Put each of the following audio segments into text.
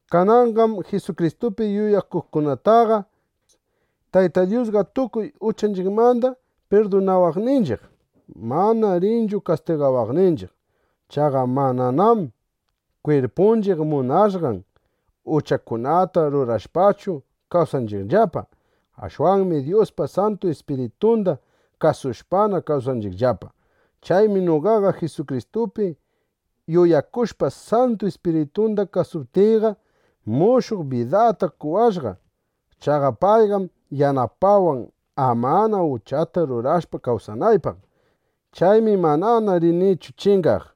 Kananqam Jisukristupi yuyakuqkunataqa Tayta Dyusqa tukuy uchanchiqmanda pirdunawaqninchiq, manana rinchu kastigawaqninchiq. Chaqa mananam kwirpunchiq munashqan uchakunata rurashpachu kawsanchiqllapa. Ashwanmi Dyuspa Santu Ispiritunda kasushpana kawsanchiqllapa. Chaymi noqaqa Jisukristupi yuyakushpa, Santu Ispiritunda kasuptiyqa, mushuq bidata qowashqa. Chaqa payqam yanapawan, amana uchata rurashpa kawsanaypaq. Chaymi manana rinichu chingaq.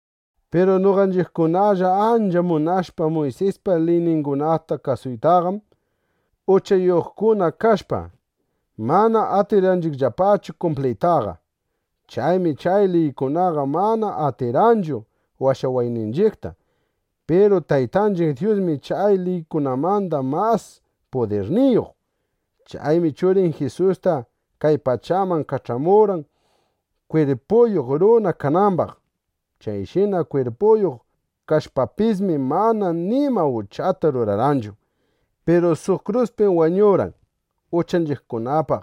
Piru noqanchiqkunalla ancha munashpa Muysispa liyningunata kasuytaqam, uchayuqkuna kashpa, mana atirqanchiqllapachu kumpliytaqa. Chaymi chay liykunaqa mana atirqanchu washawayninchiqta. Piru Taytanchiq Dyusmi chay liykunamanda mas pudirniyuq. Chaymi Churin Jisusta kay pachaman kach'amurqan, kwirpuyuq runa kanambaq. Chayshina kwirpuyuq kashpapismi, mana nima uchata rurarqanchu. Piru suq kruspim wañurqan, uchanchiqkunapaq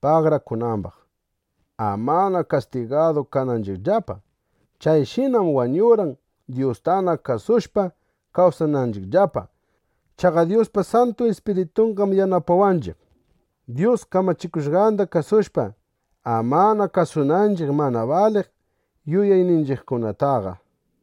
pagarakunambaq, amana kastigadu kananchiqllapa. Chayshinam wañurqan, Dyustana kasushpa kawsananchiqllapa. Chaqa Dyuspa Santu Ispiritunqam yanapawanchiq, Dyus kamachikushqanda kasushpa, amana kasunanchiq mana baliq yuyayninchiqkunataqa.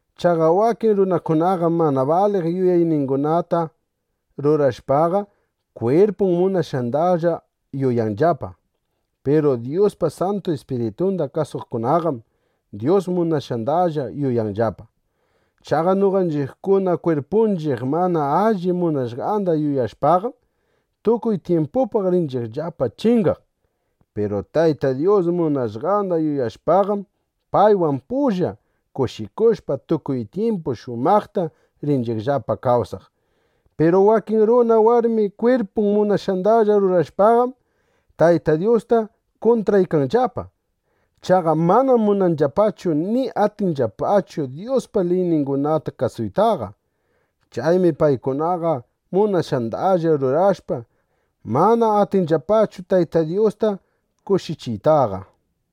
Chaqa wakin runakunaqam mana baliq yuyayningunata rurashpaqa, kwirpun munashqandalla yuyanllapa. Piru Dyuspa Santu Ispiritunda kasuqkunaqam Dyus munashqandalla yuyanllapa. Chaqa noqanchiqkuna kwirpunchiq mana alli munashqanda yuyashpaqam, tukuy tyimpupaq rinchiqllapa chingaq. Piru Tayta Dyus munashqanda yuyashpaqam, paywan pulla kushikushpa, tukuy tyimpu shumaqta rinchiqllapa kawsaq. Piru wakin runa, warmi kwirpun munashqandalla rurashpaqam, Tayta Dyusta kuntraykanllapa. Chaqa manam munanllapachu ni atinllapachu Dyuspa liyningunata kasuytaqa. Chaymi paykunaqa munashqandalla rurashpa, mana atinllapachu Tayta Dyusta kushichiytaqa.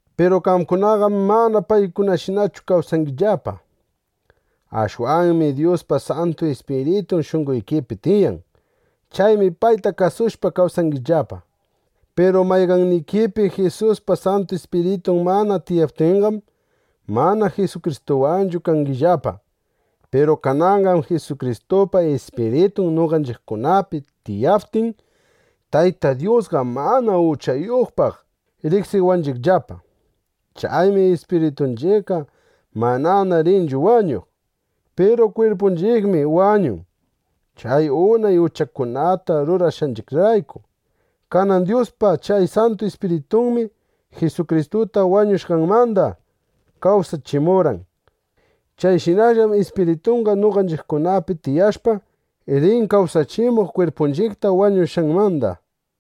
Piru qamkunaqam mana paykunashinachu kawsangillapa. Ashwanmi Dyuspa Santu Ispiritun shunqoykipi tiyan. Chaymi payta kasushpa kawsangillapa. Piru mayqannikipi Jisuspa Santu Ispiritun mana tiyaptinqam, mana Jisukristuwanchu kangillapa. Piru kananqam Jisukristupa Ispiritun noqanchiqkunapi tiyaptin, Tayta Dyusqa manana uchayuqpaq riqsiwanchiqllapa. Chaymi ispiritunchiqqa manana rinchu wañuq. Piru kwirpunchiqmi wañun, chay unay uchakunata rurashqanchiqrayku. Kanan Dyuspa chay Santu Ispiritunmi Jisukristuta wañushqanmanda kawsachimurqan. Chayshinallam Ispiritunqa noqanchiqkunapi tiyashpa, rin kawsachimuq kwirpunchiqta wañushqanmanda.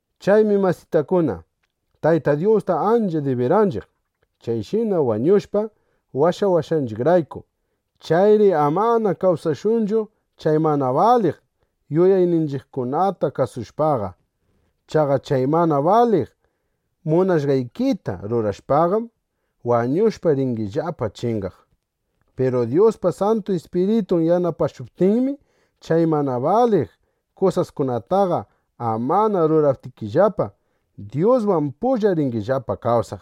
Chaymi masitakuna, Tayta Dyusta ancha dibiranchiq, chayshina wañushpa, washawashqanchiqrayku. Chayri amana kawsashunchu chay mana baliq yuyayninchiqkunata kasushpaqa. Chaqa chay mana baliq munashqaykita rurashpaqam, wañushpa ringillapa chingaq. Piru Dyuspa Santu Ispiritun yanapashuptinmi, chay mana baliq kusaskunataqa amana ruranaykillapa, Dyuswan pulla ringillapa kawsaq.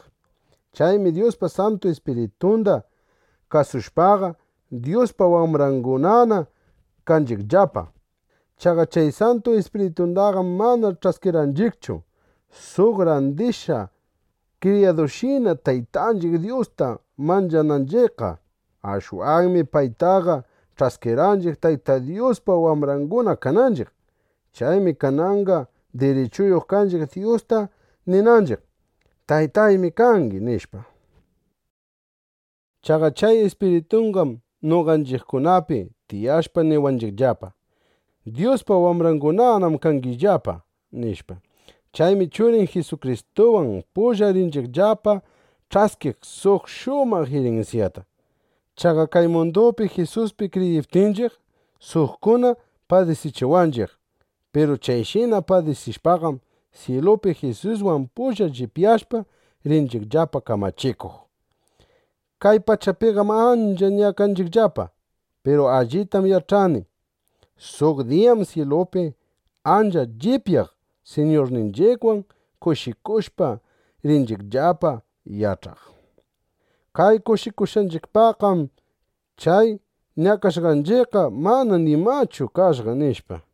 Chaymi Dyuspa Santu Ispiritunda kasushpaqa, Dyuspa wambrangunana kanchiqllapa. Chaqa chay Santu Ispiritundaqam mana ch'askirqanchiqchu suq randishqa kriyadushina, Taytanchiq Dyusta manchananchiqqa. Ashwanmi paytaqa ch'askirqanchiq, Tayta Dyuspa wambranguna kananchiq. Chaymi kananqa dirichuyuq kanchiq Dyusta ninanchiq: “Taytaymi kangi”, nishpa. Chaqa chay Ispiritunqam noqanchiqkunapi tiyashpa niwanchiqllapa: “Dyuspa wambrangunanam kangillapa”, nishpa. Chaymi Churin Jisukristuwan pulla rinchiqllapa ch'askiq suq shumaq irinsyata. Chaqa kay mundupi Jisuspi kriyiptinchiq, suqkuna padisichiwanchiq. Piru chayshina padisishpaqam, syilupi Jisuswan pulla llipyashpa, rinchiqllapa kamachikuq. Kay pachapiqam ancha ñakanchiqllapa. Piru allitam yach'ani: Suq diyam syilupi ancha llipyaq Siñurninchiqwan kushikushpa, rinchiqllapa yach'aq: Kay kushikushqanchiqpaqqam chay ñakashqanchiqqa mana nimachu kashqa, nishpa.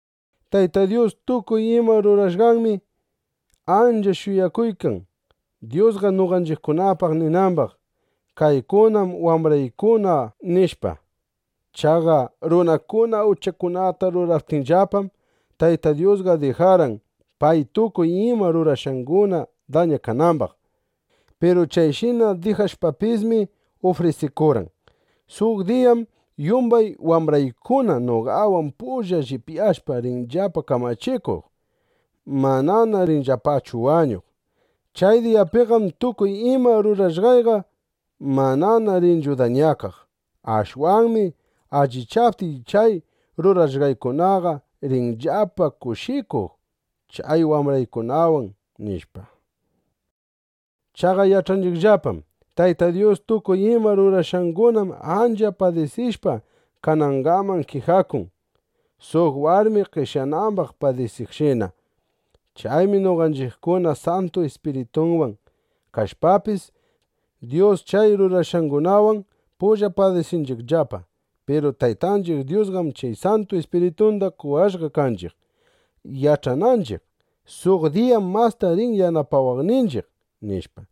Tayta Dyus tukuy ima rurashqanmi ancha shuyakuykan, Dyusqa noqanchiqkunapaq ninambaq: “Kaykunam wambraykuna”, nishpa. Chaqa runakuna uchakunata ruraptinllapam, Tayta Dyusqa dijarqan, pay tukuy ima rurashqanguna dañakanambaq. Piru chayshina dijashpapismi, ufrisikurqan: “Suq diyam yumbay wambraykuna noqawan pulla llipyashpa, rinllapa kamachikuq. Mananam rinllapachu wañuq. Chay diyapiqam tukuy ima rurashqayqa manana rinchu dañakaq. Ashwanmi allichaptiy, chay rurashqaykunaqa rinllapa kushikuq chay wambraykunawan”, nishpa. Chaqa yach'anchiqllapam: Tayta Dyus tukuy ima rurashqangunam ancha padisishpa kanangaman kijakun, suq warmi qeshyanambaq padisiqshina. Chaymi noqanchiqkuna Santu Ispirituwan kashpapis, Dyus chay rurashqangunawan pulla padisinchiqllapa. Piru Taytanchiq Dyusqam chay Santu Ispiritunda qowashqa kanchiq, yach'ananchiq: Suq diyam masta rin yanapawaqninchiq, nishpa.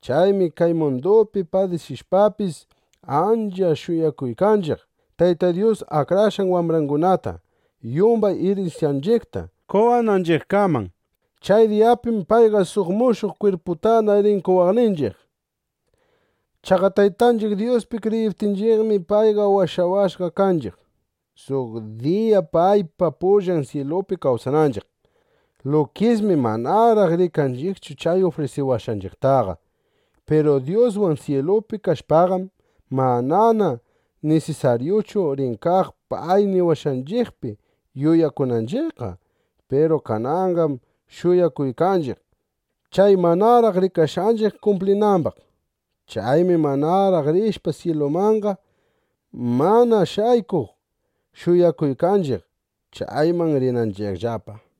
Chaymi kay mundupi padisishpapis, ancha shuyakuykanchiq, Tayta Dyus akrashqan wambrangunata yumbay irinsyanchiqta qowananchiqkaman. Chay diyapim payqa suq mushuq kwirputana rin qowaqninchiq. Chaqa Taytanchiq Dyuspi kriyiptinchiqmi, payqa washawashqa kanchiq, suq diya paypa pullan syilupi kawsananchiq. Lukismi manaraq rikanchiqchu chay ufrisiwashqanchiqtaqa. Piru Dyuswan syilupi kashpaqam, manana nisisaryuchu rin kaq pay niwashqanchiqpi yuyakunanchiqqa. Piru kananqam shuyakuykanchiq, chay manaraq rikashqanchiq kumplinambaq. Chaymi manaraq rishpa syilumanqa, mana shaykuq shuyakuykanchiq, chayman rinanchiqllapa.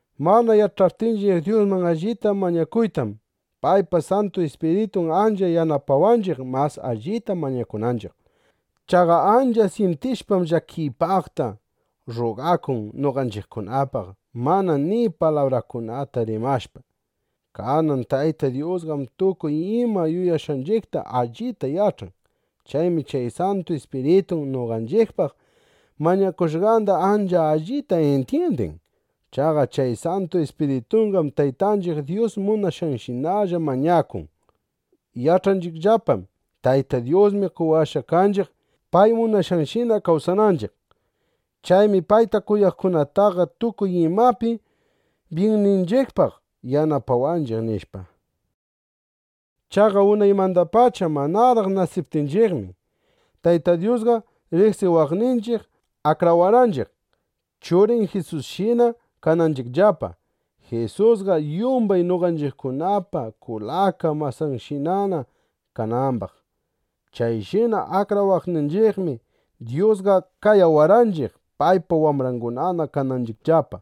Mana yach'aptinchiq Dyusman allita mañakuytam, paypa Santu Ispiritun ancha yanapawanchiq mas allita mañakunanchiq. Chaqa ancha syintishpam llakiypaqta, rrugakun noqanchiqkunapaq mana ni palabrakunata rimashpa. Kanan Tayta Dyusqam tukuy ima yuyashqanchiqta allita yach'an. Chaymi chay Santu Ispiritun noqanchiqpaq mañakushqanda ancha allita intyindin. Chaqa chay Santu Ispirituqam Taytanchiq Dyus munashqanshinalla mañakun. Yach'anchiqllapam: Tayta Dyusmi qayawashqa kanchiq, pay munashqanshina kawsananchiq. Chaymi payta kuyaqkunataqa tukuy imapi byinninchiqpaq yanapawanchiq, nishpa. Chaqa unaymandapacha manaraq nasiptinchiqmi, Tayta Dyusqa riqsiwaqninchiq akrawarqanchiq, Churin Jisusshina kananchiqllapa, Jisusqa yumbay noqanchiqkunapa kulaka masanchiqshina kanambaq. Chayshina akrawaqninchiqmi, Dyusqa qayawarqanchiq, paypa wambranguna kananchiqllapa.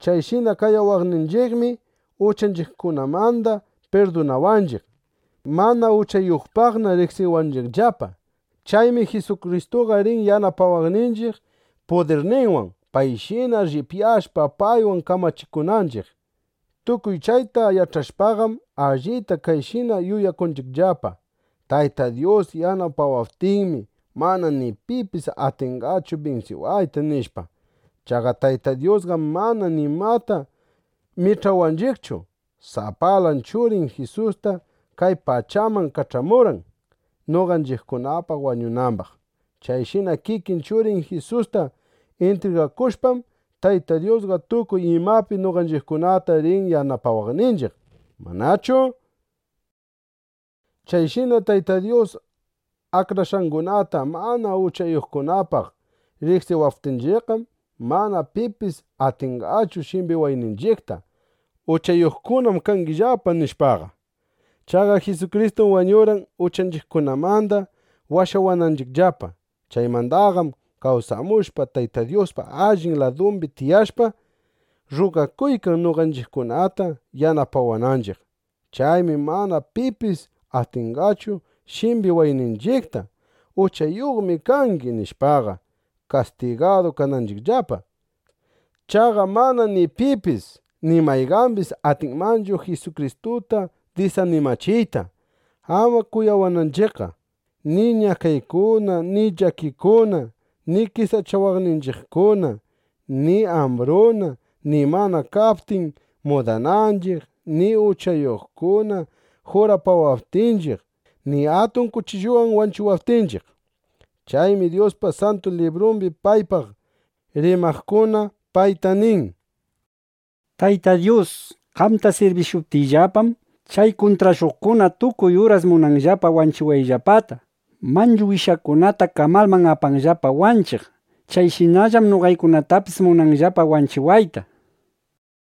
Chayshina qayawaqninchiqmi, uchanchiqkunamanda pirdunawaqninchiq, mana uchayuqpaqna riqsiwanchiqllapa. Chaymi Jisukristuqa rin yanapawaqninchiq pudirninwan, payshina llipyashpa, paywan kamachikunanchiq. Tukuy chayta yach'ashpaqam, allita kayshina yuyakunchiqllapa: Tayta Dyus yanapawaptinmi, mana ni pipis atinqachu binsiwayta, nishpa. Chaqa Tayta Dyusqam mana nimata mich'awaqninchiqchu, sapalan Churin Jisusta kay pachaman kach'amurqan, noqanchiqkunapaq wañunambaq. Chayshina kikin Churin Jisusta intrigakushpam, Tayta Dyusqa tukuy imapi noqanchiqkunata rin yanapawaqninchiq, ¿manachu? Chayshina Tayta Dyus akrashqangunata mana uchayuqkunapaq riqsiwaptinchiqqam, mana pipis atinqachu shimbiwayninchiqta: “Uchayuqkunam kangillapa”, nishpaqa. Chaqa Jisukristum wañurqan, uchanchiqkunamanda washawananchiqllapa. Chaymandaqam kawsamushpa, Tayta Dyuspa allin ladumbi tiyashpa, rrugakuykan, noqanchiqkunata yanapawananchiq. Chaymi mana pipis atinqachu shimbiwayninchiqta: “Uchayuqmi kangi”, nishpaqa, kastigadu kananchiqllapa. Chaqa mana ni pipis ni mayqambis atinmanchu Jisukristuta disanimachiyta, ama kuyawananchiqqa: ni ñakaykuna, ni llakikuna, ni qesachawaqninchiqkuna, ni ambruna, ni mana kaptin mudananchiq, ni uchayuqkuna jurapawaptinchiq, ni atun kuchilluwan wanchiwaptinchiq. Chaymi Dyuspa Santu Librumbi paypaq rimaqkuna payta nin: Tayta Dyus, qamta sirbishuptiyllapam, chay kuntrashuqkuna tukuy uras munanllapa wanchiwayllapata. Manchu wishakunata kamalman apanllapa wanchiq (wanchinanllapa). Chayshinallam noqaykunatapis munanllapa wanchiwayta, nishpa.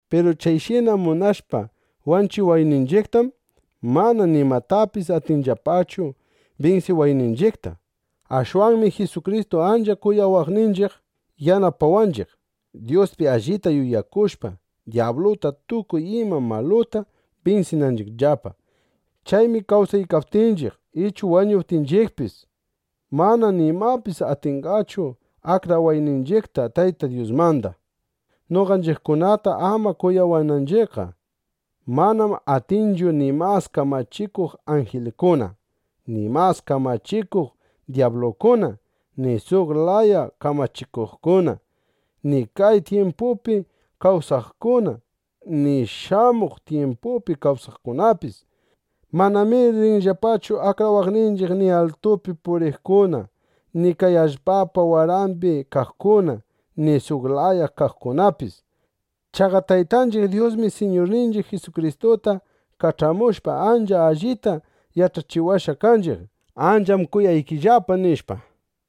Piru chayshina munashpa wanchiwayninchiqtam, mana nimatapis atinllapachu binsiwayninchiqta. Ashwanmi Jisukristu ancha kuyawaqninchiq yanapawanchiq, Dyuspi allita yuyakushpa, dyabluta, tukuy ima maluta binsinanchiqllapa. Chaymi kawsaykaptinchiq ichu wañuptinchiqpis, mana nimapis atinqachu akrawayninchiqta Tayta Dyusmanda, noqanchiqkunata ama kuyawananchiqqa. Manam atinchu ni mas kamachikuq anjilkuna, ni mas kamachikuq dyablukuna, ni suq laya kamachikuqkuna, ni kay tyimpupi kawsaqkuna, ni shamuq tyimpupi kawsaqkunapis. Manamir rinllapachu akrawaqninchiq ni altupi puriqkuna ni kay allpapa warambi kaqkuna ni suq laya kaqkunapis. Chaqa Taytanchiq Dyusmi Siñurninchiq Jisukristuta kach'amushpa, ancha allita yach'achiwashqa kanchiq: Ancham kuyaykillapa, nishpa.